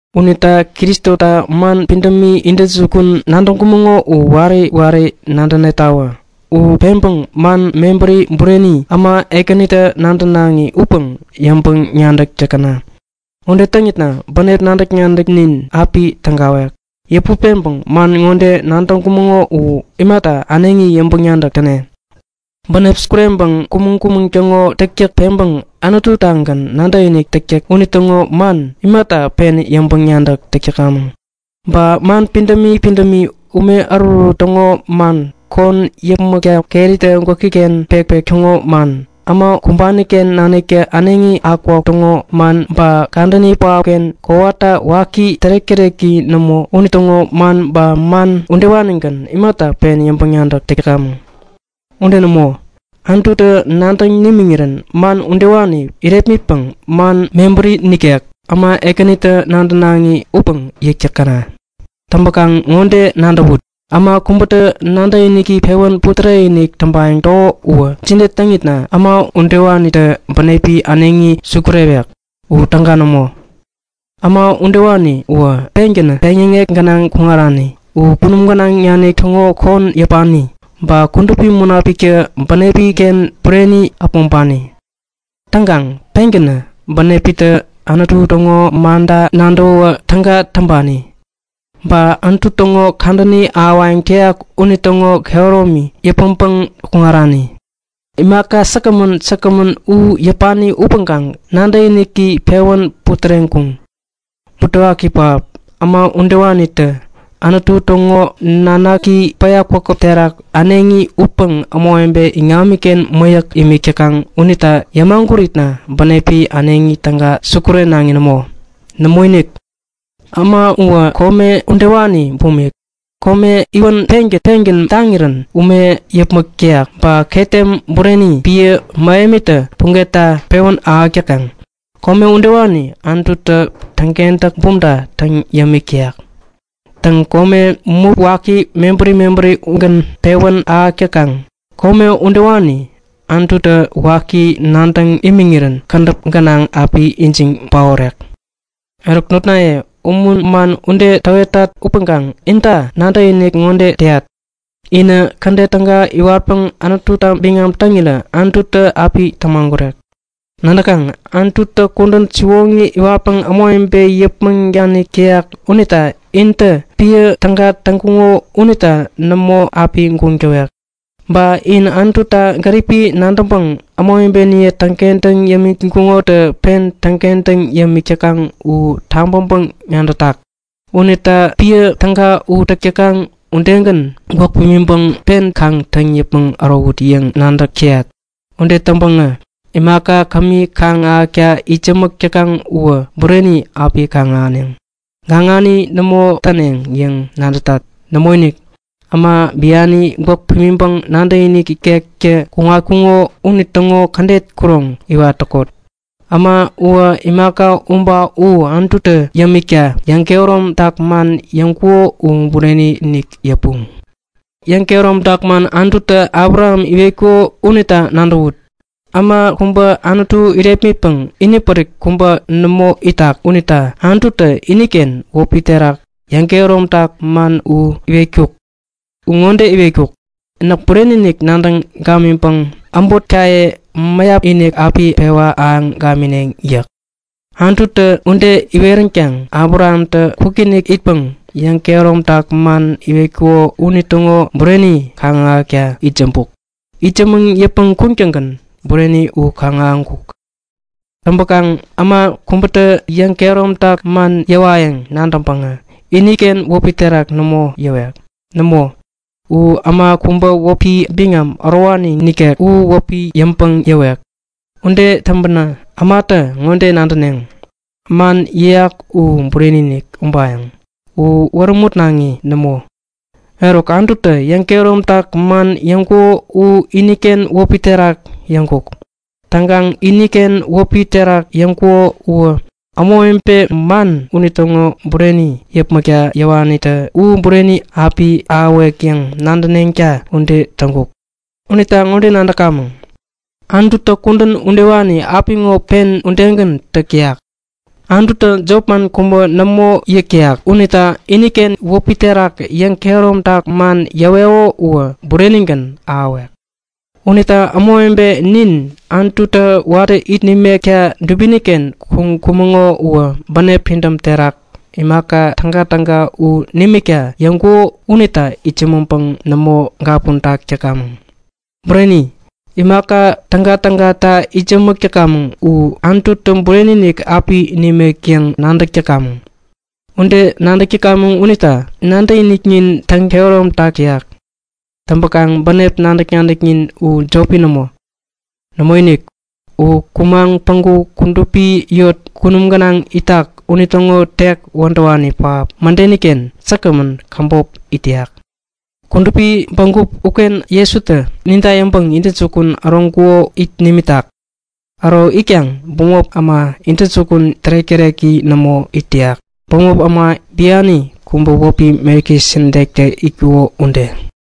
Unita Kristota man pidämi intäjukun nadäŋkumäŋo u wari wari nadänetawä! U peŋpäŋ man mebäri bureni, äma ekänitä nadänaŋi upäŋ yäŋpäŋ-nadäk täkäna. Ude täŋitna bänep nadäk-nadäknin api tägawek. Yäput peŋpäŋ man ŋode nadäŋkumäŋo u imata äneŋi yäŋpäŋ-nadäk täne? Bänep sukureŋpäŋ kumäŋ-kumäŋ täŋo täktäk peŋpäŋ Anutu-tagän nadäkinik täktäk unitäŋo man imata pen yäŋpäŋ-nadäk täk täkamäŋ? Ba man pidämi pidämi, ume ärutärut täŋo man, kon yäpmäkta keritä gwäki-ken pekpek täŋo man, äma kumbani-ken naniktä äneŋi akukakuk täŋo man ba kadäni pähapken kowata waki tärek-täreki nämo unitäŋo man ba man udewanigän imata pen yäŋpäŋ-nadäk täk täkamäŋ? Ude nämo, Anututä nadäŋ nimiŋirän man udewani yärepmitpäŋ, man mebäri nikek, äma ekänitä nadänaŋi upäŋ yäk täkäna! Täŋpäkaŋ ŋode nadäwut; Äma kubätä nadäkiniki pewän putärek-inik täŋpayäŋ täko uwä jide täŋitna äma udewanitä bänepi äneŋi sukurewek? U täga nämo! Äma udewani uwä pengän peŋyäŋek gänaŋ kuŋarani. U kunum gänaŋ nanik täŋo kon yäpani. Ba Kudupi Munapiktä bänepi-ken bureni äpmoŋpani. Täŋkaŋ pengänä bänepitä Anutu täŋo manta nadäwä täga täŋpani. Ba Anutu täŋo kadäni ahäwayäŋ täyak unitäŋo kehäromi yäpmäŋpäŋ kuŋarani. Imaka säkgämän säkgämän u yäpani upäŋkaŋ nadäkiniki pewän putäreŋkuŋ. Butewaki pähap! Äma udewanitä Anutu täŋo Nanaki päya kwakäp terak äneŋi utpäŋ ämawebe iŋamiken mäyäk imik täkaŋ unita yämaguritna bänepi äneŋi täga sukurenaŋi nämo. Nämoinik! Äma uwä kome udewani bumik. Kome iwän pengän pengän taŋirän ume yäpmäk täyak ba ketem bureni piä mähemitä pugetta pewän ahäk täkaŋ, kome udewani Anututä täŋkentäk bumta täŋ yämik täyak. Täŋ, kome mup waki mebäri mebäri ugän pewän ahäk täkaŋ, kome udewani Anututä waki nadäŋ imiŋirän kädäp gänaŋ api ijiŋ paorek. Eruk notnaye, umun man ude täwetat upäŋkaŋ inta nadäkinik ŋode täyat; Inä kädet täga iwatpäŋ Anututa biŋam täŋirä Anututä api tämagurek. Nadäkaŋ, Anututä kudän siwoŋi iwatpäŋ ämawebe yäpmäŋ danik täyak unita intä piä täga täŋkuŋo unita nämo api guŋ täwek. Ba in Anututa gäripi nadäŋpäŋ ämawebeniye täŋkentäŋ yämiŋkuŋotä pen täŋkentäŋ yämik täkaŋ u tabäŋpäŋ-nadätak. Unita piä täga u täk täkaŋ udegän gwäk pimiŋpäŋ pen kaŋ täŋ yäpmäŋ ärowut yäŋ nadäk täyat. Ude täŋpäŋä imaka kämi kaŋ-ahäkta itsämäk täkaŋ uwä bureni api kaŋ-ahäneŋ. Gaŋani nämo täneŋ yäŋ täwetat! Nämoinik, äma biani gwäk pimiŋpäŋ nadäkinik ikektä kuŋatkuŋo unitäŋo kädet kuroŋ iwat täkot. Äma uwä imaka u ba u Anututä yämikta yäŋkehäromtak man yäŋkuko u bureni-inik yäpuŋ. Yäŋ-kehäromtak man Anututä Abraham iwetkuko unita nadäwut. Äma kubä Anutu irepmitpäŋ inipärik kubä nämo itak unita Anututä iniken wäpi terak yäŋkehäromtak man u iwetkuk. U ŋode iwetkuk; Näk bureni-inik nadäŋ gamiŋpäŋ äbotkaye mäyap-inik api pewa ahäŋ gamineŋ yäk. Anututä ude iweränkaŋ Abrahamtä kwikinik itpäŋ yäŋkehäromtak man iwetkuko unitäŋo bureni kaŋ-ahäkta itsämbuk. Itsämäŋ yäpmäŋ kuŋtäŋgän bureni u kaŋ-ahäŋkuk. Täŋpäkaŋ äma kubätä yäŋkehäromtak man yäwayäŋ nadäŋpäŋ iniken wäpi terak nämo yäwek. Nämo, u äma kubä wäpi biŋam ärowani nikek u wäpi yäŋpäŋ yäwek. Ude täŋpänä ämatä ŋode nadäneŋ; Man yäyak u bureni-inik ubayäŋ. U wärämutnaŋi nämo. Eruk, Anututä yäŋkehäromtak man yäŋkuko u iniken wäpi terak yäŋkuk. Täŋkaŋ iniken wäpi terak yäŋkuko uwä ämawebe man unitäŋo bureni yäpmäkta yäwanitä u bureni api ahäwek yäŋ nadäneŋta ude täŋkuk. Unita ŋode nadäkamäŋ; Anututä kudän udewani apiŋo pen udegän täk täyak. Anututä jopman kubä nämo yäk täyak unita iniken wäpi terak yäŋkehäromtak man yäweko uwä burenigän ahäwek. Unita ämawebe nin Anututä watä it nimekta dubini-ken kuŋkumäŋo uwä bänep pidäm terak imaka tägatäga u nimikta yäŋkuko unita itsämäŋpäŋ nämo gapuntak täkamäŋ. Bureni, imaka täga-tägata itsämäk täkamäŋ u Anututä bureni-inik api nimek yäŋ nadäk täkamäŋ. Ude nadäk täkamäŋ unitä nadäkiniknin täŋ-kehäromtak täyak. Täŋpäkaŋ bänep nadäk-nadäknin u jopi nämo. Nämoinik, u kumaŋ päŋku kudupi yot kunum gänaŋ itak unitäŋo tek wädäwani pähap mädeni-ken säkgämän käbop it täyak. Kudupi bägup uken Jesutä ninta yäŋpäŋ intäjukun äroŋkuko it nimitak. Äro itkaŋ bämop äma intäjukun tärek-täreki nämo it täyak, bämop äma biani kubä wäpi Melkisedektä itkuko ude.